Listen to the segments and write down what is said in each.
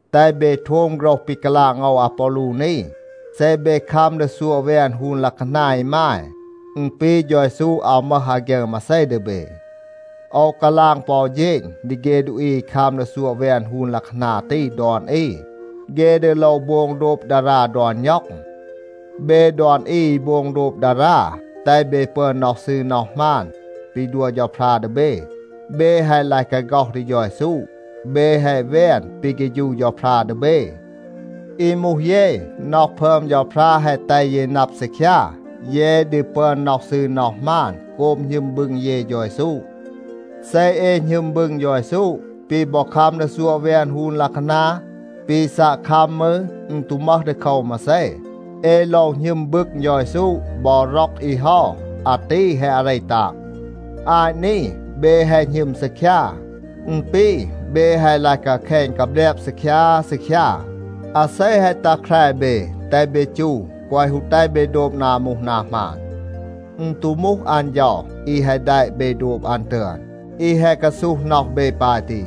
แตห เบ โทม โฆรห ปี กาลาง โอว อาปอลู นี. เซ เบ คัม ดี ซัวะ แวน ฮูน ลัะคานา อีมาย, อึณ ปี เฌา เยซู อาว มึห อาฆยึร มาเซ ดี เบ. โอว กาลาง ปอ อู เฌณ ดี เฆ ดูอี อี คัม ดี ซัวะ แวน ฮูน ลัะคานา ตี ดอน อี, เฆ ดี โลว โบง โดบ ดารา ดอน ณ็อง. เบ ดอน อี อี โบง โดบ ดารา, แตห เบ ปึอน น็อห ซืร น็อห หมาน ปี ดัว เฌาพรา ดี เบ, เบ แฮะ ลาย กาฆ็อห ดี เฌา เยซู. เบ แฮะ แวน ปี เฆฌู เฌาพรา ดี เบ. อี มูห เย, น็อห พึอม เฌาพรา แฮะ แตห เย นับ ซีคยา, เย ดี ปึอน น็อห ซืร น็อห หมาน โกบ หณึม บึง เย เฌา เยซู. เซ เอ หณึม บึง เฌา เยซู, ปี บอ คัม ดี ซัวะ แวน ฮูน ลัะคานา, ปี ซัะ คัม มืร, อึณ ตู มึห ดีโคว มาเซ. เอ โลว หณึม บึง เฌา เยซู บอ ร็อก อี เฮา. อาตี แฮะ อาเร ตาง. อาต นี เบ แฮะ หณึม ซีคยา. อึณ ปี เบ แฮะ ลาย กาแคณ กาแบลบ ซีคยา ซีคยา. อาเซ แฮะ ตัห แคร เบ, แตห เบ จู, แกวะ ฮู แตห เบ โดบ นา มูห นา หมาน. อึณ ตู มูห อัน เฌา อี แฮะ แดะ เบ โดบ อัน ตึอน, อี แฮะ กาซูห น็อห เบ ปาย ตี.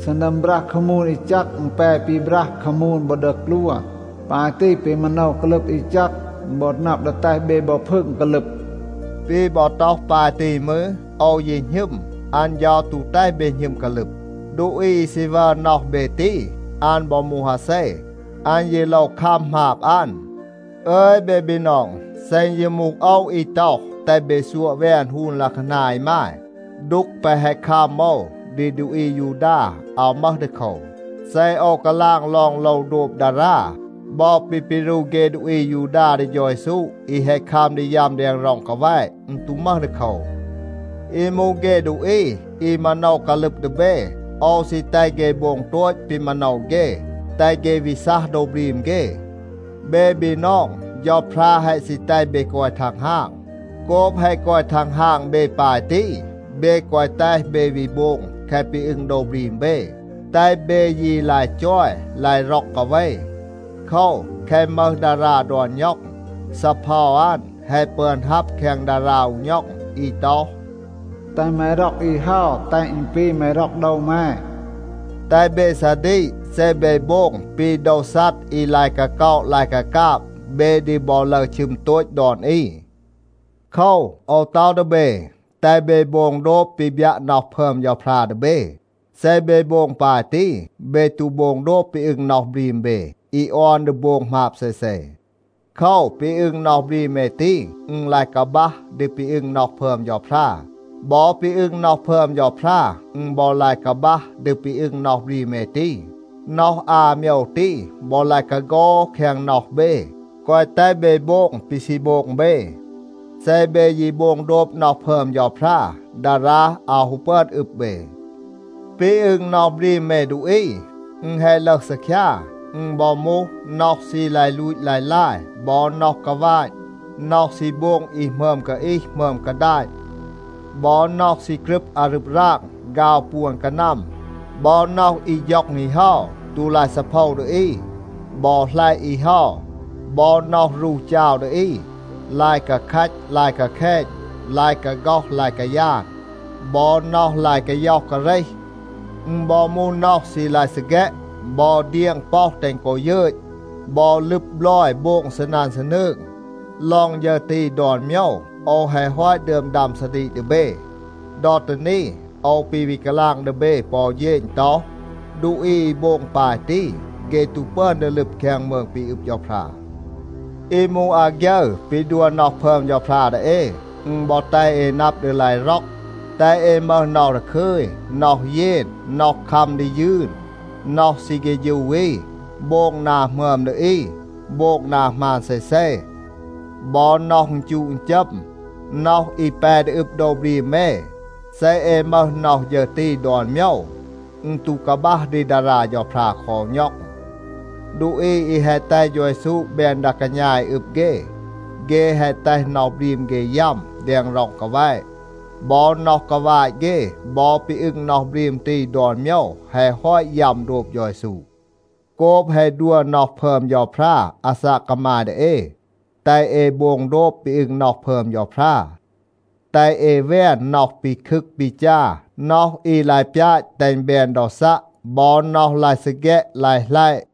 ซีนัม บรัห คามูน อี แจก, อึณ แป ปีบรัห คามูน บอ ดีกลวน. ปาย ตี, ปี มาโนว กาลึบ อี แจก, อึณ บอ นับ ดี แตห เบ บอ พึง กาลึบ. ปี บอ ต็อห ปาย ตี มืร, โอว ยี หณึม, อัน เฌา ตู แตห เบ หณึม กาลึบ. ดูอี อี ซี วัร น็อห เบ ตี, อัน บอ มูห อาเซ, อัน ยี โลว คัม หมาบ อัน. อึย เบ บีนอง, เซ อึณ ยี มูห โอว อี ต็อห, แตห เบ ซัวะ แวน ฮูน ลัะคานา อีมาย, ดูก แปะ แฮะ คัม โอว ดี ดูอี อายูดา อาว มึห ดีโคว. เซ โอว กาลาง ลอง โลว โดบ ดารา, บอ ปี ปีรู เฆ ดูอี อายูดา ดี เฌา เยซู อี แฮะ คัม ดี ยัม แดง ร็อง กาแวะ, อึณ ตู มึห ดีโคว. อี มูห เฆ ดูอี อี มาโนว กาลึบ ดี เบ, โอว ซี แตห เฆ โบง โตต ปี มาโนว เฆ, แตห เฆ วี ซัห โดว บรีม เฆ. เบ บีนอง, เฌาพรา แฮะ ซี แตห เบ กอย ทังฮาง. โกบ แฮะ กอย ทังฮาง เบ ปาย ตี, เบ แกวะ แตห เบ วี โบง แคะ ปี อึง โดว บรีม เบ. แตห เบ ยี ลาย จอย, ลาย ร็อก กาเว. โคว, แคะ มึห ดารา ดอน ณ็อง, ซีเพา อัน แฮะ ปึอน ฮับ แคง ดารา อู ณ็อง อี ต็อห, “แตห แม ร็อก อี เฮา, แตห อึณ ปี แม ร็อก โดว แม.” แตห เบ ซาดีก, เซ เบ โบง ปี โดว ซัด อี ลาย กาก็อะ ลาย กากาบ, เบ ดี บอ ลึร ชึม โตต ดอน อี. โคว, โอว ต็อห ดี เบ, แตห เบ โบง โดบ ปี บยัะ น็อห พึอม เฌาพรา ดี เบ. เซ เบ โบง ปาย ตี, เบ ตู โบง โดบ ปี อึง น็อห บรีม เบ อี ออน ดี โบง หมาบ เซเซ. โคว, ปี อึง น็อห บรีม เอ ตี, อึณ ลาย กาบัห ดี ปี อึง น็อห พึอม เฌาพรา. บอ ปี อึง น็อห พึอม เฌาพรา, อึณ บอ ลาย กาบัห ดี ปี อึง น็อห บรีม เอ ตี. น็อห อา โมยว ตี, บอ ลาย กาโฆห แคง น็อห เบ, แกวะ แตห เบ โบง ปี ซี โบง เบ. เซ เบ ยี โบง โดบ น็อห พึอม เฌาพรา, ดารา อาว ฮู ปึอน อึบ เบ. ปี อึง น็อห บรีม เอ ดูอี, อึณ แฮะ ลึห ซีคยา. อึณ บอ มูห น็อห ซี ลาย ลูต ลาย ลาย, บอ น็อห กาวาต, น็อห ซี โบง อี หมึอม กาอีห หมึอม กาดาต. บอ น็อห ซี กรึบ อารึบ ราง, ฆาว ปวน กานัม, บอ น็อห อี ฌ็อง อี เฮา, ตู ลาย ซีเพา ดี อี, บอ หลัยะ อี เฮา, บอ น็อห รู จาว ดี อี, ลาย กาแคต ลาย กาแคณ, ลาย กาฆ็อห ลาย กายาน, บอ น็อห ลาย กาย็อห กาเรห. อึณ บอ มูห น็อห ซี ลาย ซีแฆะ, บอ เดียง ป็อห แตห กอ ยึต, บอ ลึบ บลอย โบง ซีนัน ซีนืง. ลอง ฌึร ตี, ดอน โมยว โอว แฮะ ฮอต ดึอม ดัม ซาดีก ดี เบ. ดอ ตี นี, โอว ปี วี กาลาง ดี เบ ปอ อู เฌณ ต็อห, ดูอี อี โบง ปาย ตี, เฆ ตู ปึอน ดี ลึบ แคง มืง ปี อึบ เฌาพรา. อี มูห อาฆยึร ปี ดัว น็อห พึอม เฌาพรา ดี เอ, อึณ บอ แตห เอ นับ ดี ลาย ร็อก, แตห เอ มึห น็อห ดาคึย, น็อห เยน, น็อห คัม ดี ยืน, น็อห ซี เฆฌู อี, โบง นา หมึอม ดี อี, โบง นา หมาน เซเซ, บอ น็อห อึณจูะ อึณจัม, น็อห อี แป ดี อึบ โดว บรีม เอ. เซ เอ มึห น็อห ฌึร ตี ดอน โมยว, อึณ ตู กาบัห ดี ดารา เฌาพรา คอ อู ณ็อง. ดูอี อี แฮะ แตห เฌา เยซู แบน ดา กาณา อี อึบ เฆ, เฆ แฮะ แตห น็อห บรีม เฆ ยัม แดง ร็อง กาแวะ. บอ น็อห กาวาต เฆ บอ ปี อึง น็อห บรีม ตี ดอน โมยว แฮะ ฮอต ยัม โดบ เฌา เยซู. โกบ แฮะ ดัว น็อห พึอม เฌาพรา อาซาก กามาย ดี เอ, แตห เอ โบง โดบ ปี อึง น็อห พึอม เฌาพรา. แตห เอ แวน น็อห ปีคึก ปีจา, น็อห อี ลาย ปยาต แตห อึณ แบน ดอซัะ, บอ น็อห ลาย ซีแฆะ ลาย หลัยะ.